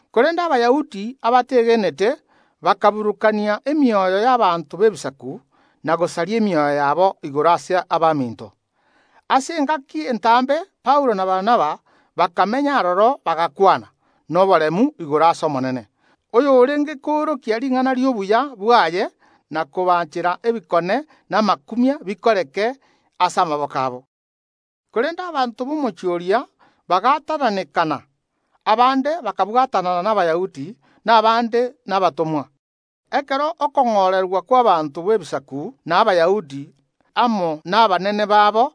Korende Abayahudi abategenete bakaburukania emioyo y’abanto b’Ebisaku na gosaria emioyo yabo igoro ase abaminto. Ase engaki entambe Paulo na Barnaba bakamenya aroro, bagakwana noboremu igoro ase Omonene, oyorenge koorokia ring’ana ri’obuya bwaye na kobanchera ebikone na amakumia bikoreke ase amaboko abo. Korende abanto b’omochie oria bagaatananekana. Abande bakabwatana n’Abayahudi na abande nabatomwa. Ekero okong’orerwa kw’abaanto b’Ebisaku na Abayahudi amo n’abanene babo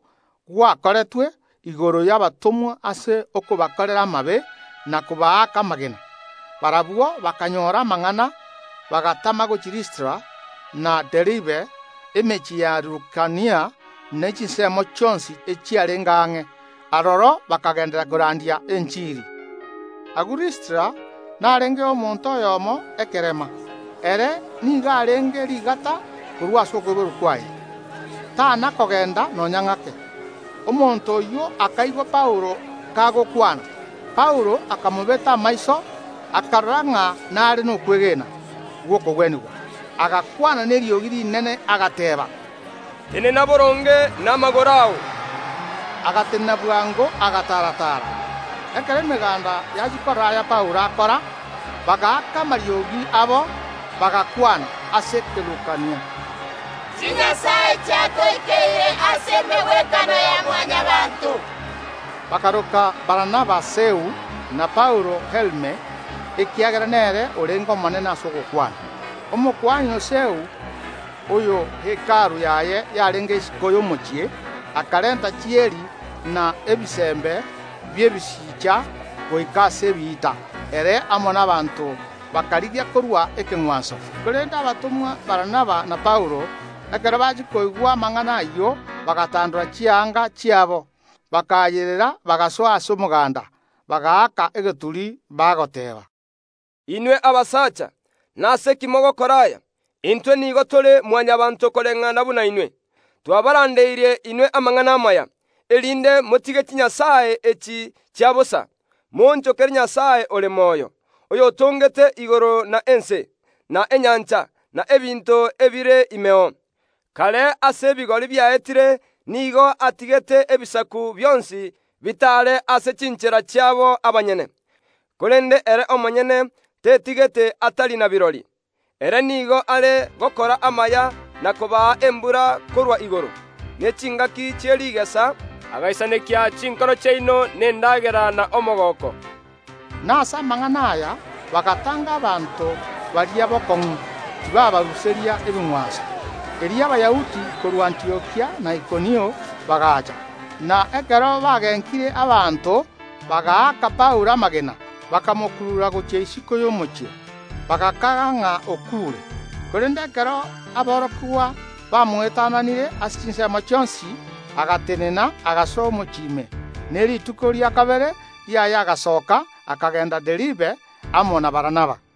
gwakoretwe igoro y’abatomwa ase okobakorera amabe na kobaaka amagena, barabwo bakanyora amang’ana, bagatama gochia Listra na Deribe, emechie ya Lukania, ne chinsemo chionsi echiarenge ang’e. Aroro bakagenderera korandia enchiri. Agwo Listra narengeo omonto oyomo ekerema. Ere nigo arenge rigata korwa ase okoiborwa kwaye, tana kogenda nonya ng’ake. Omonto oyio akaigwa Paulo kagokwana. Paulo akamobeta amaiso, akarora ng’a nare nokwegena gw’okogwenigwa, agakwana neriogi rinene, agateeba: “Tenena boronge namagoro ao.” Agatenena bwango, agataarataara. Ekero emeganda yachia korora aya Paulo akora, bagaaka amariogi abo, bagakwana ase Ekelukania: “Chinyasae chiatoikeire ase emegwekano ya Mwanyabaanto!” Bakaroka Barnaba Zeu, na Paulo Herme, ekiagera nere orenge omonene ase ogokwana. Omokuani o Zeu, oyo Hekalu yaye yarenge isiko y’omochie, akarenta chieri na ebisembe bi’ebisicha goika ase ebiita; ere amo n’abanto bakarigia korua ekeng’wanso. Korende abatomwa Barnaba na Paulo, ekero bachia koigwa amang’ana ayio bagatandora chianga chiabo, bakaayerera, bagasoa ase omoganda, bagaaka egeturi, bagoteeba, “Inwe abasacha! Nase ki mogokora aya? Intwe nigo tore Mwanyabaanto koreng’ana buna inwe. Twabarandeirie inwe amang’ana amaya, erinde motige chinyasae echi chia bosa, moonchokere Nyasae ore moyo, oyotongete igoro na ense, na enyancha, na ebinto ebire imeo. Kare ase ebigori biaetire nigo atigete ebisaku bionsi bitaare ase chinchera chiabo abanyene, korende ere omonyene tetigete atari na kirori. Ere nigo are gokora amaya na kobaa embura korwa igoro, ne chingaki chi’erigesa, agaisanekia chinkoro chiaino nendagera na omogooko.” Na ase amang’ana aya bagatanga abanto baria bokong’u, tibaabaruseria ebing’wanso. Erio Abayahudi korwa Antiokia na Ikonio bagaacha, na ekero bagenkire abanto bagaaka Paulo amagena, bakamokurura gochia isiko y’omochie, bagakaga ng’a okuure, Korende ekero aborokigwa bamoetananire ase chinsemo chionsi, agatenena, agasoa omochie ime, ne rituko ria kabere riaye agasoka, akagenda Deribe amo na Barnaba.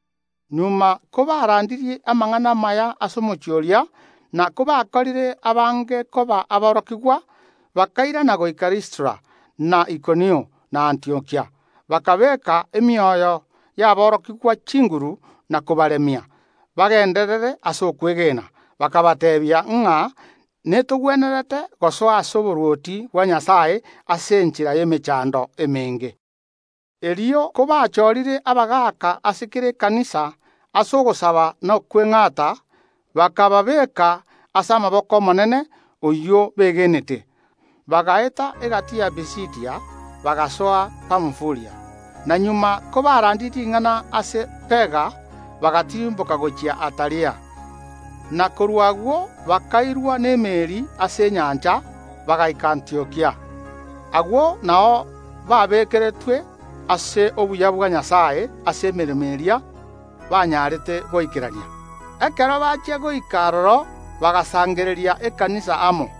Magega kobarandirie amang’ana amaya ase omochie oria, na kobakorire abange koba aborokigwa, bakairana goika Listra, na Ikonio, na Antiokia, bakabeeka emioyo yaborokigwa chinguru na kobaremia bagenderere ase okwegena, bakabateebia ng’a: “Netogwenerete gosoa ase oborwoti bwa Nyasae ase enchera y’emechando emenge.” Erio kobachorire abagaaka ase kera ekanisa ase ogosaba na okweng’ata, bakababeeka ase amaboko y’Omonene, oyio begenete. Bagaeta gati ya Pisidia, bagasoa Pamfulia. Na magega kobarandirie ring’ana ase Perga, bagatirimboka gochia Atalia, na korwa agwo bakairwa n’emeeri ase enyancha, bagaika Antiokia. Agwo nao babeekeretwe ase obuya bwa Nyasae ase emeremo eria banyarete goikerania. Ekero bachia goika aroro bagasangereria ekanisa amo,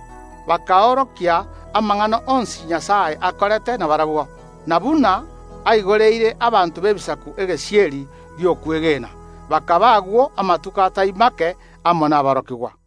bakaorokia amang’ana onsi Nyasae akorete nabarabwo, na buna aigoreire abanto b’Ebisaku egesieri gi’okwegena. Bakaba agwo amatuko atai make amo naborokigwa.